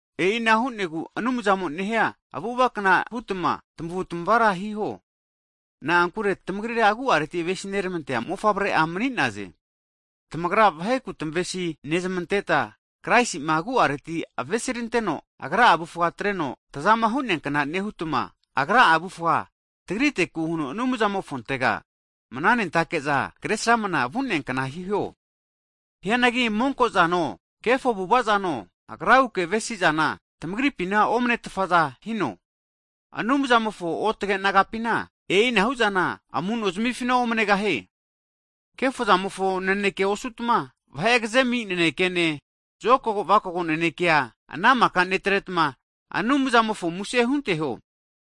E'ina hu'negu Anumzamo nehia avu'avakna hutma tamavutmavara hiho, nankure tamagrira agu'areti avesi nermantea mofavre'a mani'naze, tamagra vaheku tamavesi nezmanteta, Kraisi'ma agu'areti avesiranteno agra'a avufga atreno tazama hu'neakna nehutma, Agra'a avufa tagriteku huno Anumzamofontega mananentake'za kre sramna vu'neakna hiho. Hianagi monko'zano, kefo avu'avazano, agraguke avemasi'zana tamagripina omne tfaza hino, Anumzamofo otage nagapina (saints) e'inahu zana amu'no zamifina omnegahie. Kefo'zamofo naneke osutma, vahe agze ami nanekene, zokago vakago nanekea ana maka netretma Anumzamofo muse hunteho.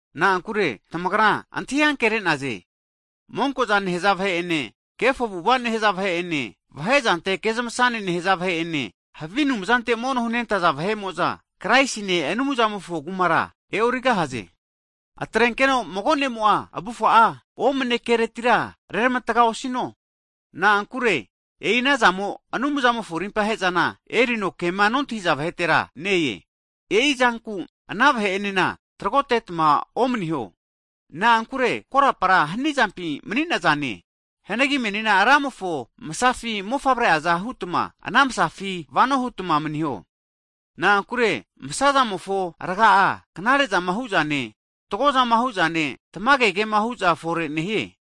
Na'ankure tamagra antahi ankere'naze, monko'za nehza vahe'ene, kefo avu'ava nehaza vahe'ene, vahe'zante kezmasane nehaza vahe'ene, havi anumzante mono hunentaza vahe'mo'za, Kraisine, Anumzamofo kumara e'origahaze. Atrenkeno mago nemo'a avufa'a omne keretira reramatga osino, na'ankure e'i ana zamo Anumzamofo rimpa he'zana erino kema nontahiza vahetera ne-e. E'i zanku ana vahe'enena tragotetma omaniho. Na'ankure korapara hanizampi mani'nazane, hianagi menina Ramofo Msafi mofavre'aza hutma, ana msafi vano hutma maniho. Na'ankure msazamofo raga'a, knare'zama hu'zane, fatgozama hu'zane, tamage kema hu'za fore nehie.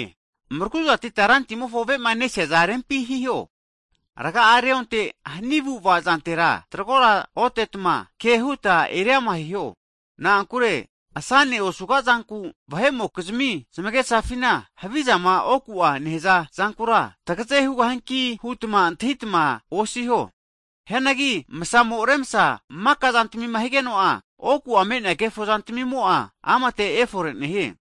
Mraguzatitma Rantamimofo avema nesiaza rempi hiho. Rga'a reonteno hani avu'ava zantera tragora otetma, ke huta eriama hiho, na'ankure asane osuga'zanku vahe'mokizmi zamagesafina havizama oku'a nehaza zankura tagaze hugahianki hutma antahitma osiho. Hianagi msamo remsa maka zantmina higeno'a, oku'a me'nea kefo zantmimo'a amate efore nehie.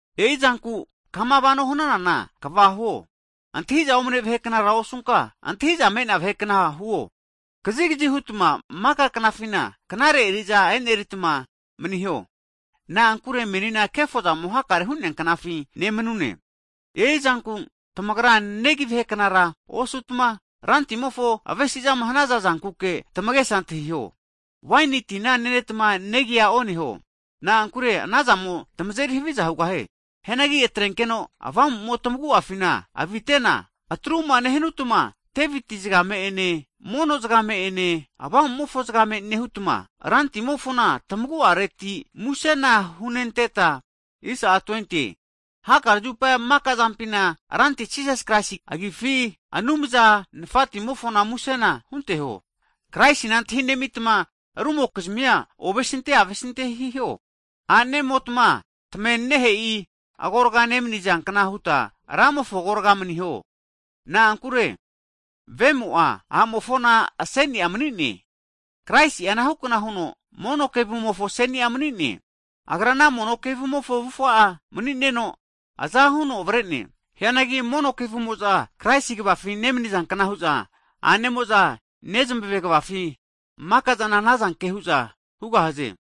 E'i zanku kama vano hananana kva huo, antahi'za omne vahe knara osunka, antahi'za me'nea vahe kna huo, kazigzi hutma maka knafina knare eri'za e'neritma maniho, na'ankure menina kefozamo hakare hu'neanknafi nemanune. E'i zanku tamagra negi vahe knara osutma, Rantimofo avesi'zama hanaza zankuke tamagesa antahiho. Waini tina netma negia oneho, na'ankure anazamo tamazeri haviza hugahie. Hianagi atrenkeno Avamu'mo tamagu'afina avitena, atruma nehanutma, Deviti zgame ene (Sams), mono zgame'ene, avamu'mofo zgame nehutma, Rantmimofona tamagu'areti musena hunenteta, hakare zupa maka zampina Ranti Jisas Kraisi agifi, Anumza Nafatimofona musena hunteho. Kraisina antahi'nemitma rumokizmia ovesinte avesinte hiho. A'nemotma, Ramofo agorga nemniza kna huta tamavenanehe'i agorga maniho. Na'ankure vemo'a, a'mofona aseni'a mani'ne. Kraisi'a anahu kna huno mono kevumofo aseni'a mani'ne. Agra ana mono kevu mofo avufa'a mani'neno aza huno avare'ne. Hianagi mono kevumo'za Kraisi kvafi nemnizankna hu'za, a'nemo'za nezmave kvafi maka'zana anazanke hu'za hugahaze.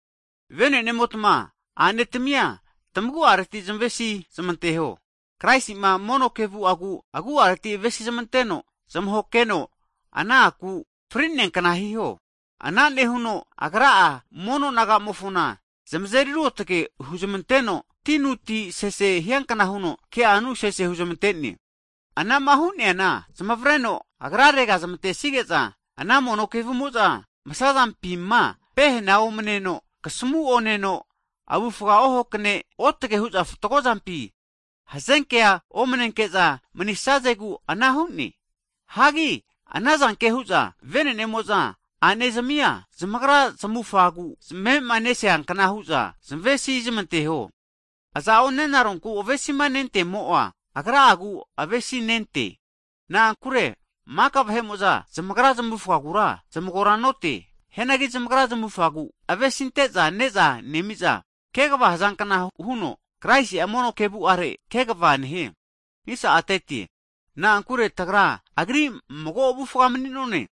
Vene'nemotma, a'ne tmia tamagu'areti zmavesi zamanteho, Kraisi'ma mono kevu'agu agu'areti avesi zamanteno zamahoke heno ana a'ku (sios) fri'nea kna hiho. Ana nehuno Agra'a mono naga'mofona zamazeri ruotge huzmanteno tinuti sese hiankna huno ke'anu sese huzmante'ne. Anama hu'neana zamavreno Agrarega zamantesige'za, ana mono kevumo'za msazampima pehena omneno, kasmu' oneno, avufa ohakne: otage hu'za fatgo zampi hazenke omnenke'za manisnazegu ana hu'ne. Hagi anazanke hu'za vene'nemo'za a'ne zamia, zamagra zamufagu zamavema nesia kna hu'za zmavesi zamanteho. Aza'o nenaronku avesima nentemo'a, agra'agu avesinente. Na'ankure maka vahe'mo'za zamagra zamufagura zamagora note, hianagi zamagra zamufagu avesinte'za ne'za nemi'za, kegva hazankna huno Kraisi'a mono' kevu'are kegva nehie. Na'ankure tagra Agri mago avufa mani'none.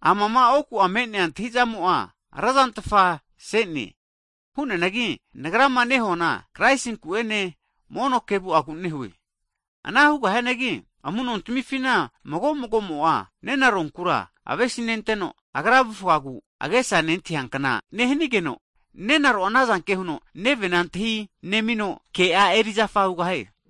Amama oku'a me'nea antahi'zamo'a, razantfa se'ne, hu'neanagi nagrama nehuana Kraisinku ene, mono kevu'agu nehue. Anahuga hianagi, amu'nontamifina mago mago'mo'a nenaronkura avesi nenteno agra avufagu agesa nentahiankna nehnigeno, nenaro'a anazanke huno nevena antahi nemino ke'a erizafa hugahie.